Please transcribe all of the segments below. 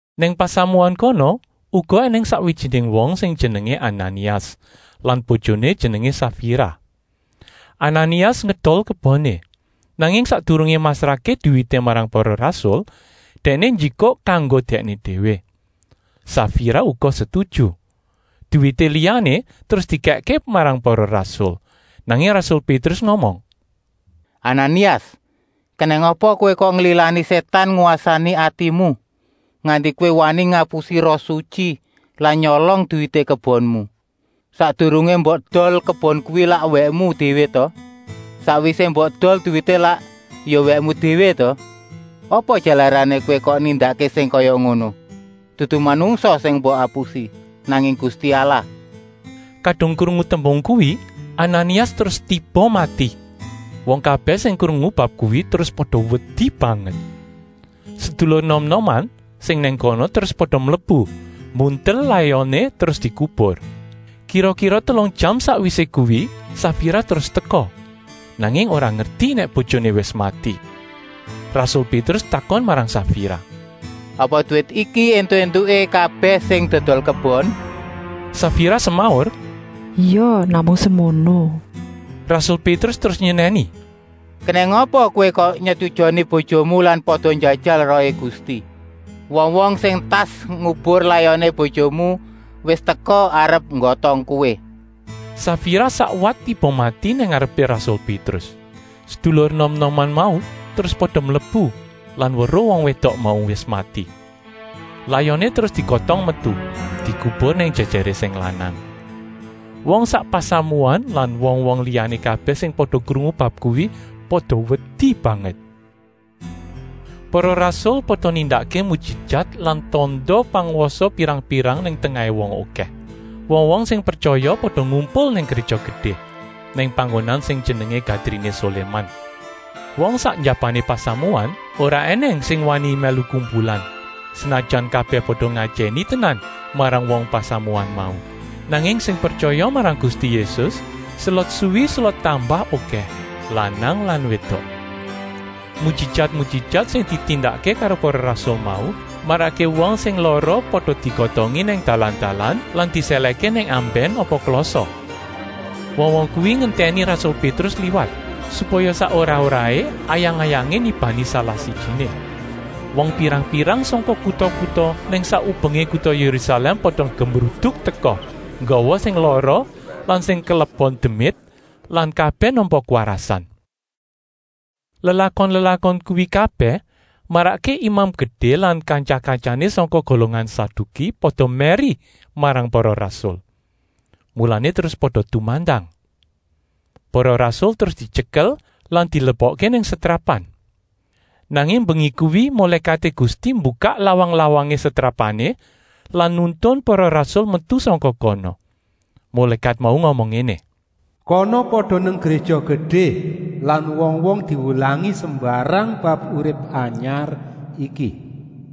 Nang pasamuan kono uga ènèng sakwijiné wong sing jenengé Ananias lan bojoné jenengé Safira. Ananias ngedol keboné, nanging sakdurungé masrahké duwité marang para rasul, dèkné njikuk kanggo dèkné déwé. Safira uga setuju. Duwité liyané terus dikèkké marang para rasul. Nanging rasul Pétrus ngomong: “Ananias, kenèng apa kowé kok nglilani Sétan ngwasani atimu, nganti kowé wani ngapusi Roh Sutyi lan nyolong duwité kebonmu? Sakdurungé mbok edol kebon kuwi lak wèkmu déwé ta? Sakwisé mbok edol duwité lak ya wèkmu déwé ta? Apa jalarané kowé kok nindakké sing kaya ngono? Dudu manungsa sing mbok apusi, nanging Gusti Allah!” Kadung krungu tembung kuwi, Ananias terus tiba mati. Wong kabèh sing krungu bab kuwi terus pada wedi banget. Sedulur enom-enoman sing nang kono terus pada mlebu, mbuntel layoné terus dikubur. Kira-kira telung jam sakwisé kuwi Safira terus teka, nanging ora ngerti nèk bojoné wis mati. Rasul Pétrus takon marang Safira: “Apa duwit iki éntuk-éntuké kabèh sing dodol kebon?” Safira semaur: “Ya, namung semono!” Rasul Pétrus terus nyenèni: “Kenèng apa kowé kok nyetujoni bojomu lan pada njajal Rohé Gusti? Wong-wong sing entas ngubur layoné bojomu wis teka arep nggotong kowé!” Safira sakwat tiba mati nang ngarepé rasul Pétrus. Sedulur enom-enoman mau terus pada mlebu lan weruh wong wédok mau wis mati. Layoné terus digotong metu, dikubur nang jèjèré sing lanang. Wong sak pasamuan lan wong-wong liyané kabèh sing pada krungu bab kuwi pada wedi banget. Para rasul pada nindakké mujijat lan tanda pangwasa pirang-pirang nang tengahé wong okèh. Wong-wong sing pretyaya pada ngumpul nang Gréja Gedé, nang panggonan sing jenengé Gadriné Soléman. Wong sak njabané pasamuan ora ènèng sing wani mèlu kumpulan, senajan kabèh pada ngajèni tenan marang wong pasamuan mau. Nanging sing pretyaya marang Gusti Yésus selot suwi selot tambah okèh, lanang lan wédok. Mujijat-mujijat sing ditindakké karo para rasul mau marakké wong sing lara pada digotongi nang dalan-dalan lan disèlèhké nang ambèn apa klasa. Wong-wong kuwi ngentèni rasul Pétrus liwat, supaya sak ora-oraé ayang-ayangé nibani salah-sijiné. Wong pirang-pirang sangka kuta-kuta nang sak ubengé kuta Yérusalèm pada gemruduk teka, nggawa sing lara lan sing kelebon demit lan kabèh nampa kwarasan. Lelakon-lelakon kuwi kabèh marakké Imam Gedé lan kantya-kantyané sangka golongan Saduki pada mèri marang para rasul. Mulané terus pada tumandang. Para rasul terus dityekel lan dilebokké nang setrapan. Nanging mbengi kuwi mulékaté Gusti mbukak lawang-lawangé setrapané lan nuntun para rasul metu sangka kono. Mulékat mau ngomong ngéné: “Kana pada nang Gréja Gedé lan wong-wong diwulangi sembarang bab urip anyar iki.”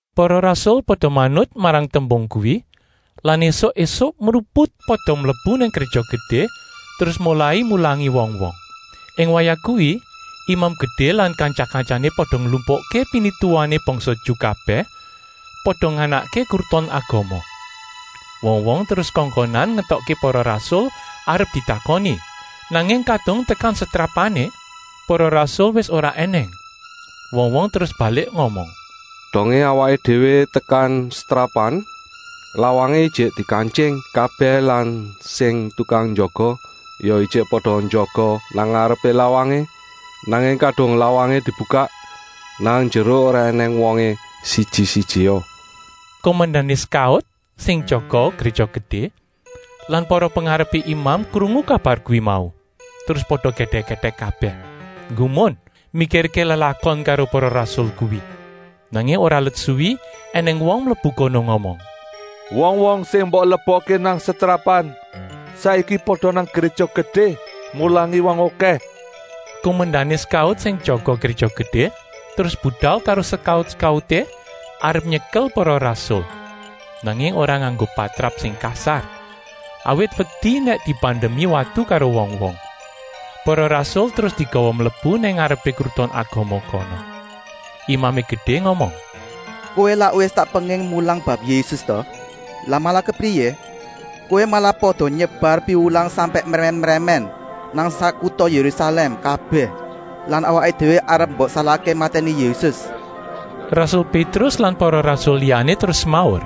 Para rasul pada manut marang tembung kuwi lan ésuk-ésuk mruput pada mlebu nang Gréja Gedé terus molai mulangi wong-wong. Ing wayah kuwi Imam Gedé lan kantya-kantyané pada nglumpukké pinituwané bangsa Ju kabèh, pada nganakké Kruton Agama. Wong-wong terus kongkonan ngetokké para rasul arep ditakoni. Nanging kadung tekan setrapané, para rasul wis ora ènèng. Wong-wong terus balik ngomong: “Dongé awaké déwé tekan setrapan, lawangé ijik dikantying kabèh lan sing tukang jaga ya ijik pada njaga nang ngarepé lawangé. Nanging kadung lawangé dibukak, nang njero ora ènèng wongé siji-sijia.” Kumendané sekaut sing jaga Gréja Gedé lan para pengarepé imam krungu kabar kuwi mau, terus pada gèdèk-gèdèk kabèh, nggumun mikirké lelakon karo para rasul kuwi. Nanging ora let suwi ènèng wong mlebu kono ngomong: “Wong-wong sing mbok lebokké nang setrapan saiki pada nang Gréja Gedé mulangi wong okèh.” Kumendané sekaut sing jaga Gréja Gedé terus budal karo sekaut-sekauté arep nyekel para rasul, nanging ora nganggo patrap sing kasar, awit wedi nèk dibandemi watu karo wong-wong. Para rasul terus digawa mlebu nang ngarepé Kruton Agama kono. Imamé Gedé ngomong: “Kowé lak wis tak penging mulang bab Yésus ta. Lah malah kepriyé? Kowé malah pada nyebar piwulang sampèk mrèmèn-mrèmèn nang sak kuta Yérusalèm kabèh lan awaké déwé arep mbok salahké matèni Yésus.” Rasul Pétrus lan para rasul liyané terus semaur: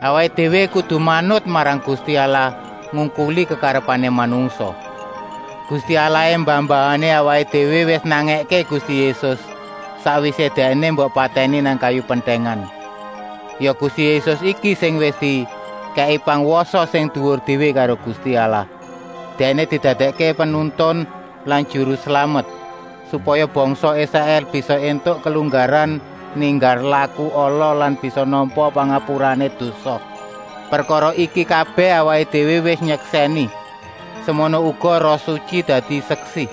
“Awaké déwé kudu manut marang Gusti Allah ngungkuli kekarepané manungsa. Gusti Allahé mbah-mbahané awaké déwé wis nangèké Gusti Yésus, sakwisé Dèkné mbok patèni nang kayu pentèngan. Ya Gusti Yésus iki sing wis dikèki pangwasa sing duwur déwé karo Gusti Allah. Dèkné didadèkké Penuntun lan Juru Slamet, supaya bangsa Israèl bisa éntuk kelunggaran ninggal laku ala lan bisa nampa pangapurané dosa. Prekara iki kabèh awaké déwé wis nyeksèni. Semono uga Roh Sutyi dadi seksi,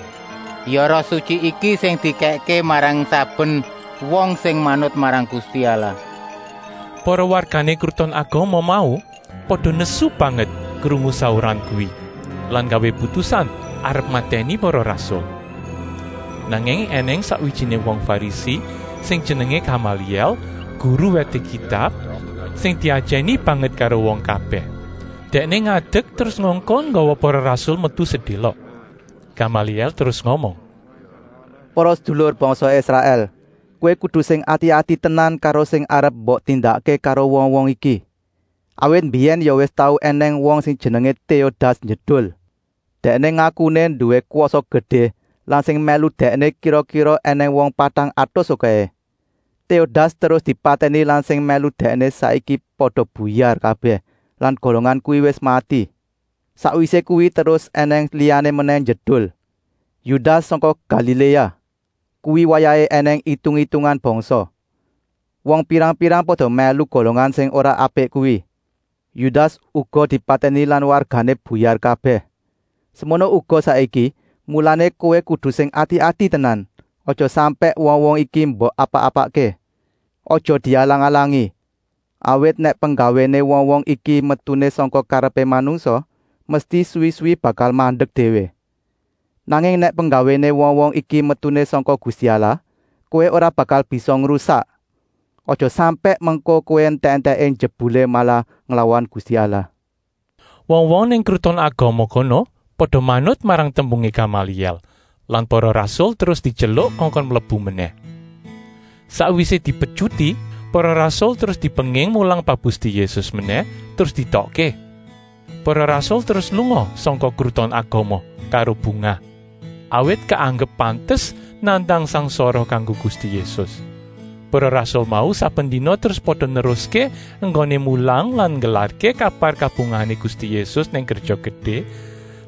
ya Roh Sutyi iki sing dikèkké marang saben wong sing manut marang Gusti Allah.” Para wargané Kruton Agama mau pada nesu banget krungu sauran kuwi, lan nggawé putusan arep matèni para rasul. Nanging ènèng sakwijiné wong Farisi sing jenengé Gamalièl, guru wèté Kitab, sing diajèni banget karo wong kabèh. Dèkné ngadek terus ngongkon nggawa para rasul metu sedélok. Gamalièl terus ngomong: “Para sedulur bangsa Israèl! Kowé kudu sing ati-ati tenan karo sing arep mbok tindakké karo wong-wong iki. Awit mbiyèn ya wis tau ènèng wong sing jenengé Téodas njedul; dèkné ngakuné nduwé kwasa gedé lan sing mèlu dèkné kira-kira ènèng wong patang atus okèhé. Téodas terus dipatèni lan sing mèlu dèkné saiki pada buyar kabèh lan golongan kuwi wis mati. Sakwisé kuwi terus ènèng liyané menèh njedul: Yudas sangka Galiléa. Kuwi wayahé ènèng itung-itungan bangsa. Wong pirang-pirang pada mèlu golongan sing ora apik kuwi. Yudas uga dipatèni lan wargané buyar kabèh. Semono uga saiki, mulané kowé kudu sing ati-ati tenan, aja sampèk wong-wong iki mbok apak-apakké. Aja dialang-alangi, awit nèk penggawéné wong-wong iki metuné sangka karepé manungsa, mesti suwi-suwi bakal mandek déwé. Nanging nèk penggawéné wong-wong iki metuné sangka Gusti Allah, kowé ora bakal bisa ngrusak. Aja sampèk mengko kowé entèk-entèké jebulé malah nglawan Gusti Allah.” Wong-wong nang Kruton Agama kono pada manut marang tembungé Gamalièl lan para rasul terus dityeluk kongkon mlebu menèh. Sakwisé dipetyuti, para rasul terus dipenging mulang bab Gusti Yésus menèh terus dietokké. Para rasul terus lunga sangka Kruton Agama karo bungah, awit keanggep pantes nandang sangsara kanggo Gusti Yésus. Para rasul mau saben dina terus pada neruské enggoné mulang lan nggelarké kabar kabungahané Gusti Yésus nang Gréja Gedé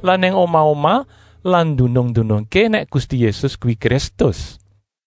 lan nang omah-omah lan ndunung-ndunungké nèk Gusti Yésus kuwi Kristus.